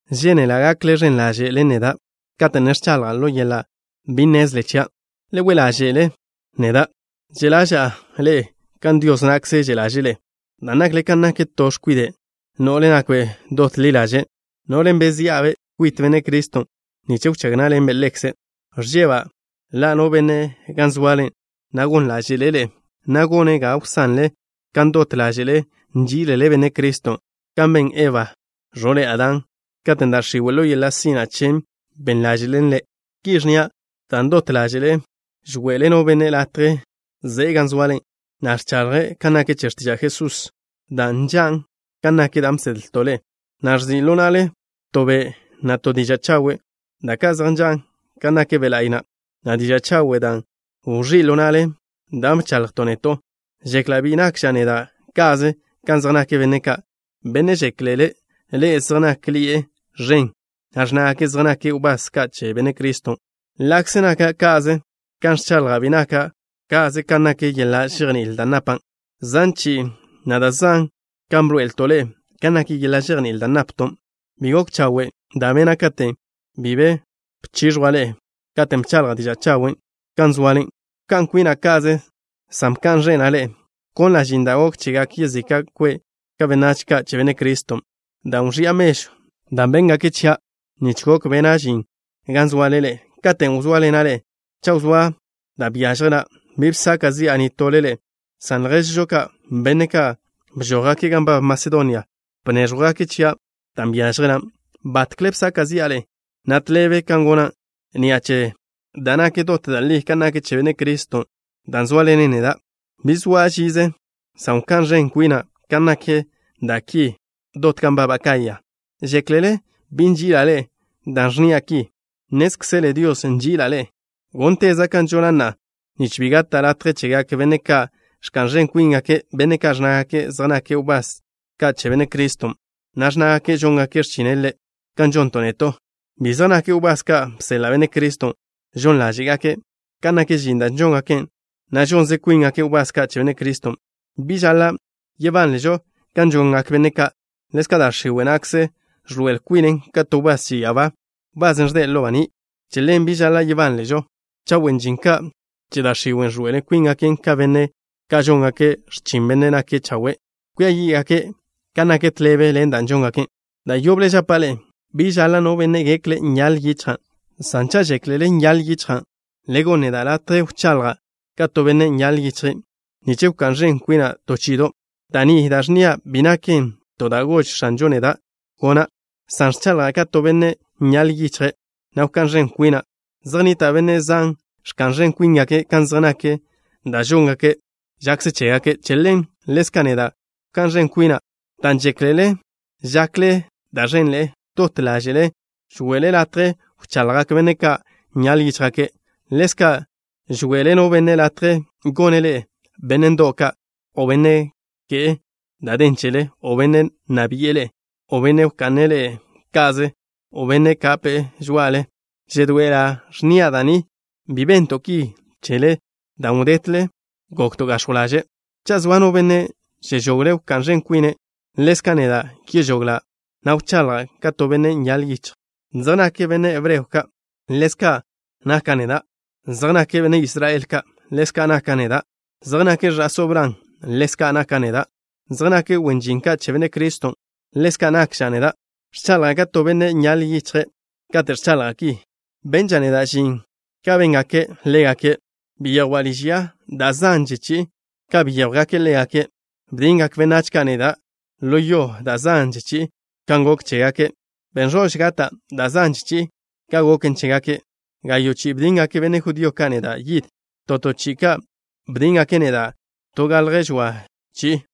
Žénela' gakle ẕen ḻaže' ḻen neda' kate' ne ẕchaḻja' ḻo yeḻa' bi nnezle chia'. Le we' ḻáže'le neda'. Že' ḻaža'a ḻe'e kan Dios na'kze že' ḻaže'e ḻe'e, dan' nakle kan nak to x̱kwide' no'le nakbe' dot ḻi ḻaže', no'len' bezía'-be' kwit Benne' Criston' nich wchág ná'ḻenbe' Ḻekze'. Ẕžeba' ḻa' no benne' gan zoale, na' gon ḻáže'le' ḻe'e, na' gone' ga wsanle kan dot ḻáže'le nží'ilele Benne' Criston', kan ben Eba, ẕo'le Adán katen' da' x̱iwe', ḻo yeḻa' sina' chen, ben ḻáže'len ḻe'. Ki ẕnnia' dan' dot ḻáže'le žwe'le no benne' latje ze'e gan zoale, na' ẕchaḻje' kan nak che x̱tiža' Jesús, da' nžan' kan nak da' bsedlto' ḻe'e, na' ẕzi' ḻo na'le to be', na' to diža' chawe', da' ka' zej nžan' kan nak Be' La'y na', na' diža' chawen' dan' wẕí' ḻo na'le da' bchaḻjto' neto'. Žekla' bi nakža' neda' ka'ze kan zej nak benne' ka', benne' žéklele ḻe'e zej nákḻi'e ẕen, na' ẕnnágake' zej nake' wbás ka' che Benne' Criston'. Ḻa'kze naka' ka'ze kan ẕchaḻja', bi naka' ka'ze kan nak yeḻa' žejní'il da' napan'. Zan chi'i, na' da' zan kan bḻoe'elto' ḻe'e kan nak yeḻa' žejní'il da' napton'. ¿Bi gok chawe' da' bena' katen' bi be bchix̱jwa' ḻe'e katen' bchaḻja' diža' chawen' gan zoale? Bka'n kwina' ka'ze, san bka'n ẕena' ḻe'e. Bkonla' žin da' gok chegak yezika' kwe' ka' benách ka' che Benne' Criston', dan' wẕi'a mežw da' bnéẕjwgake' chia' nich gok bena' žin gan zoale ḻe'e. Katen' wzóaḻena' ḻe'e, cha' wzóa da' byážjela', bi bsaka' zi'a nitole ḻe'e, san lježžo ka', benne' ka' bžójgake' gan nbab Masedonia, bnéẕjwgake' chia' dan' byážjelan'. Batkle bsaka' zi'a ḻe'e, na' tḻebe kan gona'. Ni'a che da' nak dot da' li kan nak che Benne' Criston' da' zóaḻenen neda', bi soa' žize, san wká'n ẕen kwina' kan nak da' ki dot gan nbab Acaya. ¿Žéklele bi nži'ila' ḻe'e dan' ẕnnia' ki? Nnézkzele Dios nži'ila' ḻe'e. Gónteza' kan žona' na'a, nich bi gata' latje chegak benne' ka' ẕka'n ẕen kwíngake', benne' ka' ẕnnágake' zej nake' wbás ka' che Benne' Criston', na' ẕnnágake' žóngake' x̱chine' Ḻe' kan žonton' neto'. Bi zej nake' wbás ka' bseḻa' Benne' Criston'. Žon ḻáže'gake' kan nak žin da' žóngake', na' žonze kwíngake' wbás ka' che Benne' Criston'. Bi žaḻa' yebánležo kan žongak benne' ka'. Ḻezka' da' x̱iwe' na'kze ẕḻoe'el kwinen ka to wbás che ya'abá, wbasen' ẕde' ḻo baní'. Che ḻen bi žaḻa' yebánležo cha' wen žin ka' che da' x̱iwen' ẕḻoe'el kwíngake' ka benne' ka' žóngake' x̱chin Bennen' nake' chawe'. Kwia yí'gake' kan nak tḻebe ḻen da' žóngake'. Da' yoble žapa' ḻe'e: bi žaḻa' no benne' gekle' nyaḻ yichja'. San cha' žéklele nyaḻ yichja', le gonn neda' latje wchaḻja' ka to benne' nyaḻ yichje', nich wká'n ẕen kwina' to chi'ido'. Da' ni da' ẕnnia' bi naken to da' gož X̱anžon' neda' gona', san ẕchaḻja' ka to benne' nyaḻ yichje', na' wká'n ẕen kwina'. Zej nnita' benne' zan ẕka'n ẕen kwíngake' kan zej nak da' žóngake' žakze chégake'. Che ḻen, ḻezka' neda' wká'n ẕen kwina'. Dan' žéklele žakle da' ẕenḻe'e, dot ḻáže'le žwe'le latje wchaḻjgak benne' ka' nyaḻ yíchjgake'. Ḻezka' žwe'le no benne' latje gone' ḻe'e benne' ndo'w ka', o no benne' ke'e da' den chele, o no benne' nna bi'e ḻe'e, o no benne' wka'ne' ḻe'e ka'ze, o no benne' kape'e žoa'ale. Žedoe'ela' ẕnnia' da' ni: bi bento' ki chele dan' wdetle gokto' gax̱jw ḻaže'. Cha' zoa no benne' žežogle' wká'n ẕen kwine', ḻezka' neda' yežoglan', na' wchaḻja' ka to benne' nyaḻ yichje'. ¿Zej nake' benne' hebreo ka'? Ḻezka' naka' neda'. ¿Zej nake' benne' Israel ka'? Ḻezka' naka' neda'. ¿Zej nake' ẕa'só Bran? Ḻezka' naka' neda'. ¿Zej nake' wen žin ka' che Benne' Criston'? Ḻezka' nakža' neda'. (Ẕchaḻja' ka to benne' nyaḻ yichje' kate' ẕchaḻja' ki.) Benža' neda' žin ka béngake' ḻégake'. Byejwa' liž ya da' zanže chi'i ka byéjwgake' ḻégake'. Bdingak benách ka' neda' ḻo yo da' zanže chi'i kan gok chégake'. Ben ẕož gata' da' zanže chi'i ka goken chégake'. Gayo' chi'i bdingak benne' judío ka' neda' yid. (To to chi'i ka' bdíngake' neda' to galje žoa chi'i.)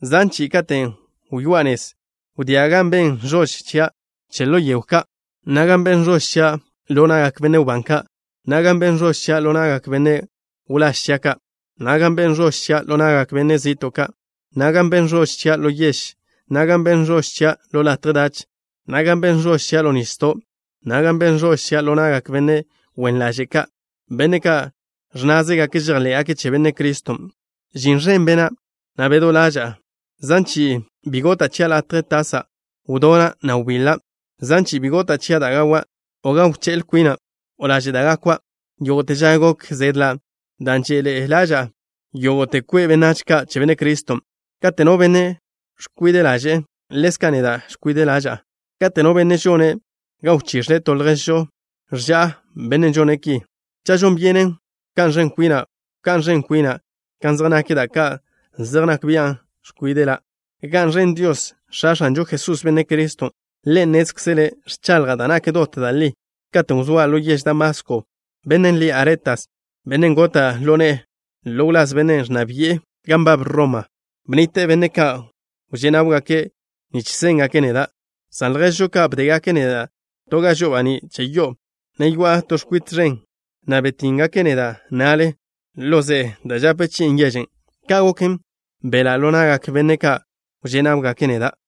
Zan chi'i katen' wyoá'a nez, wdía' gan ben ẕož chia' che ḻo yego ka', na' gan ben ẕož chia' ḻo na'gak benne' wbán ka', na' gan ben ẕož chia' ḻo na'gak benne' wláž chia' ka', na' gan ben ẕož chia' ḻo na'gak benne' zi'to' ka', na' gan ben ẕož chia' ḻo yež, na' gan ben ẕož chia' ḻo latje dach, na' gan ben ẕož chia' ḻo nisdo', na' gan ben ẕož chia' ḻo na'gak benne' wen ḻaže' ka', benne' ka' ẕnnázegake' žejḻé'gake' che Benne' Criston'. Žin ẕen bena', na' bedó ḻaža'a. Zan chi'i bi gota' chia' latje tasa'. Wdona', na' wbiḻa'. Zan chi'i bi gota' chia' da' gawa', o gan wché'l kwina', o laže' da' gakwa'. Yógo'te ža gok zedla' dan' že'ḻe'e ḻaža'a yógo'te kwe' benách ka' che Benne' Criston'. Kate' no benne' ẕkwide' ḻaže'e, ḻezka' neda' ẕkwide' ḻaža'a. Kate' no benne' žone' ga wchix̱le to lježžo, ẕža'a bennen' žone' ki. Cha' žon byenen wká'n ẕen kwina', wká'n ẕen kwina' kan zej nak da' ka' zej nak bian' ẕkwíde'la'. ¡Ga'n ẕen Dios, X̱a X̱anžo Jesús, Benne' Criston'! Ḻe' nnézkzele' ẕchaḻja' da' nak dot da' li. Katen' wzóa' ḻo yež Damasko, benne' lie' Aretas, bennen' gota' ḻo ne'e ḻo wláz benne' ẕnna bi'e gan nbab Roma, bnnite'e benne' ka' wžé' náwgake' nich séngake' neda', san lježžo ka' bdégake' neda' to ga žo'o baní' che yo'o, ne yoa'a to x̱kwite ẕen, na' btínnegake' neda' na'le ḻo ze'e da' žape chi'in yežen'. Ka' goken, belá' ḻo na'gak benne' ka' wžé' náwgake' neda'.